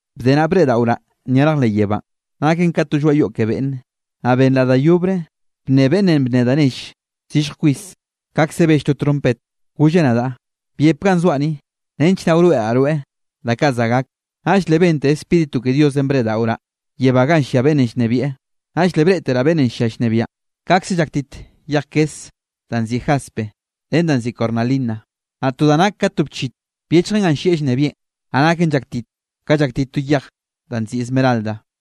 Bde naꞌ, breꞌdaꞌoraꞌ nyarj leꞌ yebánꞌ, naken ka to lloaꞌ yoꞌ ke beꞌnne. Naꞌ benraꞌ da yobre bnne beꞌnn bne da nelle zillj kwis, kaꞌkze bell to trompet, golleꞌ nadaꞌ: —Byep ganꞌ zoaꞌ ni, nench naꞌ wroeꞌraꞌ rweꞌ da kaꞌ za gak. Naꞌll le bente Spíritu ke Diosenꞌ breꞌdaꞌoraꞌ yebá ganꞌ llia beꞌnnenꞌ llnebieꞌ. Naꞌll le breꞌteraꞌ beꞌnnenꞌ llia llnebiaꞌn, nakeꞌ llaktit kaꞌkze llaktit yej kese danꞌ nziꞌi jaspe ren danꞌ nziꞌi cornalina. Naꞌ to da nak ka to bchit byechjen ganꞌ llieꞌ llnebieꞌn, naꞌ naken llaktit ka llaktit to yej danꞌ nziꞌi esmeralda.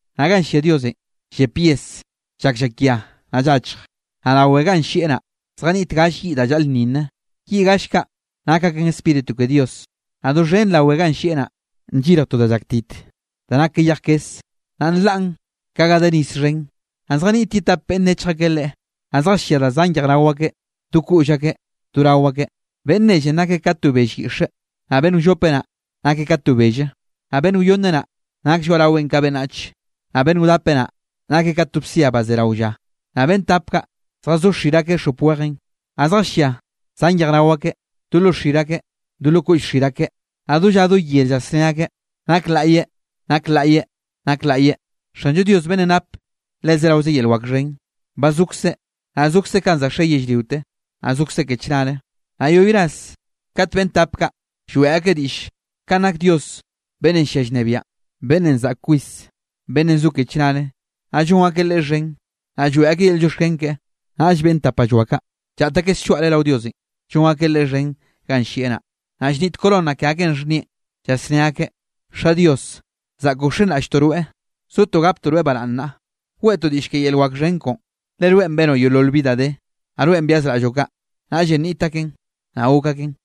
Naꞌ ganꞌ llia Diosenꞌ, llep yes llak llakia naꞌ llachj. Naꞌ rawe ganꞌ llieꞌ naꞌ, zjaniꞌt galle yiꞌ da llaꞌlnninne, yiꞌ gall kaꞌ nak aken Spíritu ke Dios. Naꞌ doxhen rawe ganꞌ llieꞌ naꞌ, nllirj to da llaktit da nak ka yej kes, naꞌ nlaꞌn ka ga de nis xhen. Naꞌ zjaniꞌt ye tap beꞌnn nechj akeꞌ Leꞌe. Naꞌ zjallia da zan yejrao akeꞌ do koꞌll akeꞌ do rao akeꞌ. Beꞌnn nellenꞌ nakeꞌ ka to bell yiꞌxe, naꞌ beꞌnn wllope naꞌ, nakeꞌ ka to belle, naꞌ beꞌnn wyonne naꞌ, nak lloaꞌraweꞌn ka beꞌnnach, naꞌ beꞌnn wdape naꞌ, nakeꞌ ka to bsia ba ze rao lla. Naꞌ beꞌnn tap kaꞌ, zjazó xir akeꞌ xop wejenꞌ, naꞌ zjallia zan yejrao akeꞌ do lo xir akeꞌ do lo koꞌll xir akeꞌ. Naꞌ do lla do yer llasné akeꞌ: Naklaꞌyeꞌ, naklaꞌyeꞌ, naklaꞌyeꞌ, Xanllo Diosenꞌ beꞌnnenꞌ nap le zeraoze yel wak xhen. Ba zokzeꞌ, naꞌ zokzeꞌ kanꞌ za xe yellriote, naꞌ zokzeꞌ ke chnare. Naꞌ yoꞌy ras kat beꞌnn tap kaꞌ lloeꞌ akeꞌ diꞌllenꞌ kanꞌ nak Dios beꞌnnenꞌ llia llnebiaꞌn, beꞌnnenꞌ zaꞌk kwis, beꞌnnenꞌ zo ke chnare, naꞌ llon akeꞌ Leꞌe xhen, naꞌ lloeꞌ akeꞌ yel llioxken keꞌe, naꞌll beꞌnn tapalloa kaꞌ, llaꞌt akeꞌ slloaꞌre rao Diosenꞌ, llon akeꞌ Leꞌe xhen ganꞌ llieꞌ naꞌ, naꞌ llniꞌt corona ke akeꞌn xhnieꞌn, llasné akeꞌ: Xa Dios, zaꞌkoꞌ wxenraꞌlltoꞌ rweꞌ, sotoꞌ gaptoꞌ rweꞌ baraꞌnne naꞌ, weꞌtoꞌ diꞌll ke yel wak xhen koꞌon, le rweꞌn benoꞌ yeolol bi da de, naꞌ rweꞌn byazraꞌlloꞌ kaꞌ, naꞌllenꞌ niꞌt aken, naꞌ gok aken.